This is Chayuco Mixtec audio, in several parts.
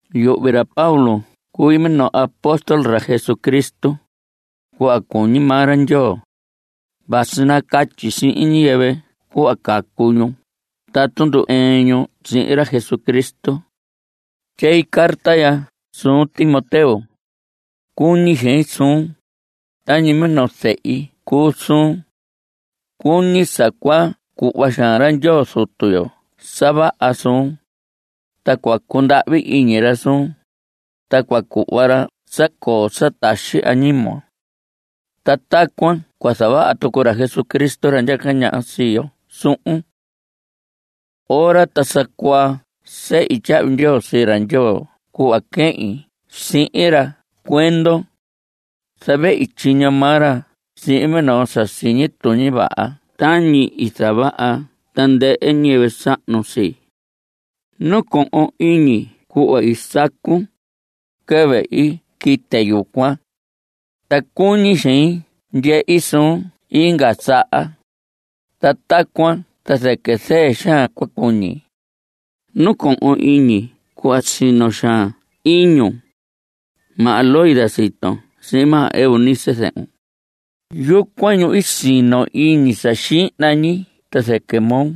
Yuhvi ra Pablo cui minoo apóstol ra Jesucristo, cuhva cuñi maa ra Ndyoo. Vasi nacatyi sihin ñiyɨvɨ cuhva cacu ñu tatu ndu‑ɨɨn ñu sihin ra Jesucristo. Tyei carta ya suun, Timoteo. Cuñi xein suun; tañi minoo zehi cuu suun. Cuñi sa cua cuhva xaan ra Ndyoo Zutu yo sa vaha suun. Ta cua cundahvi iñi ra suun. Ta cua cuhva ra sa coo sa taxi añimon. Ta tacuan cua zavaha tucu ra Jesucristo, ra ndyaca ñaha sii yo, suhun. Ora ta sa cuaa sehi tyahvi ndyoo sii ra Ndyoo cuhva quehin sihin ra cuendon. Zavehi tyiño maa ra sihin minoo sa siñi tuñi vaha tañi i zavaha tandɨhɨ ñiyɨvɨ sahnu sii. Nacohon iñi cuhva i sacun (quɨvɨ i quite yucuan). Ta cuñi xein ndyehi suun inga saha. Ta tacuan ta zɨquɨ zɨɨ xaan cua cuñi. Nacohon iñi cuhva sino xaan iñun. Maha Loida siton sihin maha Eunice zɨhun, yucuan ñu i sino iñi sa xihna ñi ta zɨquɨ moo.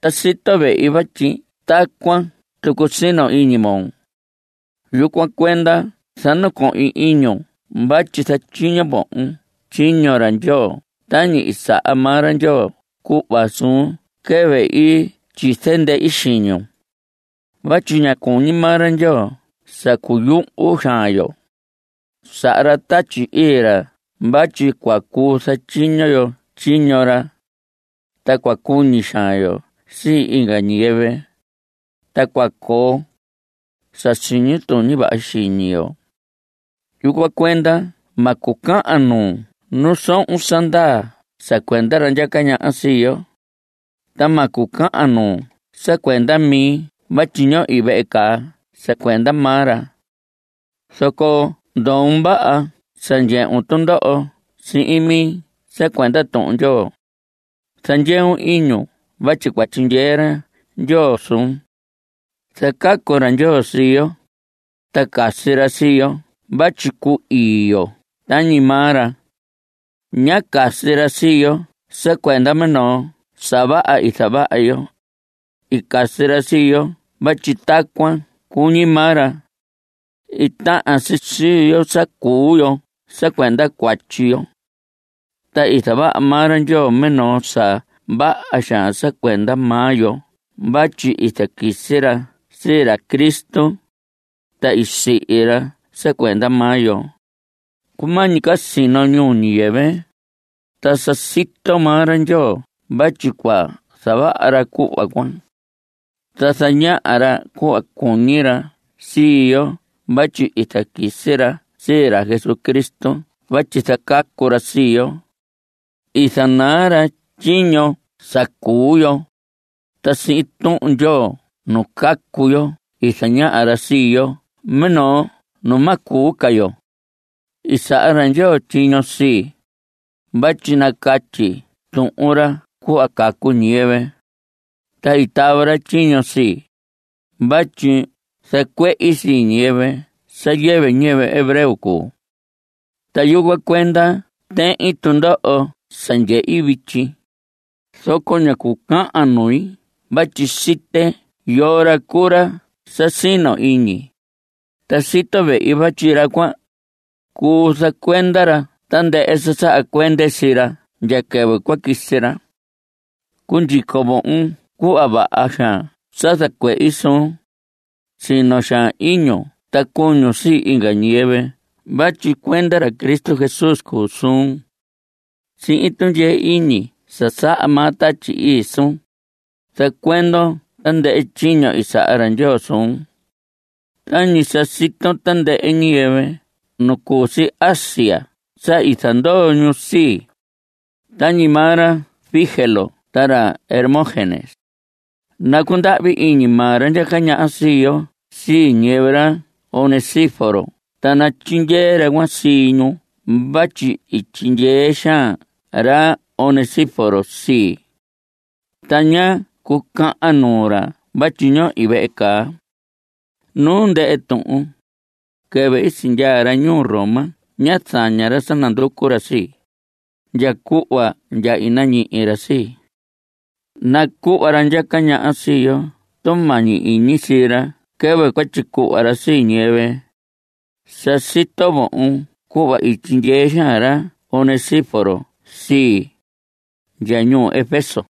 Ta sito vehi vatyi tacuan tucu sino iñi moo. Yucuan cuenda zanacohin iñun vatyi zatyiño vohon tyiño ra Ndyoo tañi i saha maa ra Ndyoo cuhva suun quɨvɨ i tyize ndehi xiñun. Vatyi ña cuñi maa ra Ndyoo sa cuyuhu xaan yo. Saha ra Tatyi Ii ra vatyi cua cuu zatyiño yo tyiño ra. Ta cua cuñi xaan yo sii inga ñiyɨvɨ, ta cua coo sa siñi tuñi vaha xiñi yo. Yucuan cuenda ma cucahan nuun nu sohon sa ndaa sa cuenda ra ndyaca ñaha sii yo. Ta ma cucahan nuun sa cuenda mi vatyi ñohi vehe caa sa cuenda maa ra. Zoco ndoon vaha sa ndyehun tundoho sihin mi sa cuenda Tuhun Ndyoo. Zandyeun iñun vatyi cua tyindyee ra Ndyoo suun. Zacacu ra Ndyoo sii yo, ta casi ra sii yo vatyi cu‑ii yo tañi maa ra. Ñá casi ra sii yo sa cuenda minoo sa vaha i zavaha yo. I casi ra sii yo vatyi tacuan cuñi maa ra. I tahan si sii yo sa cuu yo sa cuenda cuatyi yo. Ta i zavaha maa ra Ndyoo minoo sa vaha xaan sa cuenda maa yo vatyi i zaquisi ra sii ra Cristo, ta i sihi ra sa cuenda maa yo. Cumañi ca sino ñuu ñiyɨvɨ, ta sa sito maa ra Ndyoo vatyi cua zavaha ra cuhva cuan. Ta zañaha ra cuhva cuñi ra sii yo vatyi i zaquisi ra sii ra Jesucristo vatyi zacacu ra sii yo. I zanaa ra tyiño sa cuu yo, ta sihin Tuhun Ndyoo nu cacu yo i zañaha ra sii yo minoo nu ma cuu ca yo. I saha ra Ndyoo tyiño sii, vatyi nacatyi tuhun ra cuhva cacu ñiyɨvɨ. Ta i tava ra tyiño sii, vatyi zacuehi sii ñiyɨvɨ sa yɨvɨ ñiyɨvɨ hebreo cuu. Ta yucuan cuenda tehin tundoho sa ndyehi vityi. Zoco ña cucahan nui vatyi site yoo ra cuu ra sa sino iñi, ta sito vehi vatyi ra cuan, cuu zacuenda ra tandɨhɨ sa saha cuende sii ra ndya quɨvɨ cua quisi ra. Cundyico vohon cuhva vaha xaan sa zacuehi suun. Sino xaan iñun ta cuñun sii inga ñiyɨvɨ vatyi cuenda ra Cristo Jesús cuu suun. Sihin tundyee iñi sa saha maa Tatyi Ii suun, zacuendon tandɨhɨ tyiño i saha ra Ndyoo suun. Tañi sa siton, tandɨhɨ ñiyɨvɨ nu cu si Asia sa i zandoo ñu sii, tañi maa ra Figelo ta ra Hermógenes. Nacundahvi iñi maa ra ndyaca ñaha sii yo sii ñiyɨvɨ ra Onesíforo ta natyindyee ra cuan sii ñu vatyi i tyindyee xaan ra Onesíforo sii. Ta ñá cucahan nuu ra vatyi ñohi vehe caa. Nu ndɨhɨ tuhun, quɨvɨ i sindyaa ra ñuu Roma ñá zaña ra sa nanducu ra sii, ndya cuhva ndya i nañihi ra sii. Nacuhva ra ndyaca ñaha sii yo tumañi iñi sii ra quɨvɨ cua tyicuhva ra sii ñiyɨvɨ. Sa sito vohon cuhva i tyindyee xaan ra Onesíforo sii, ndya ñuu Efeso.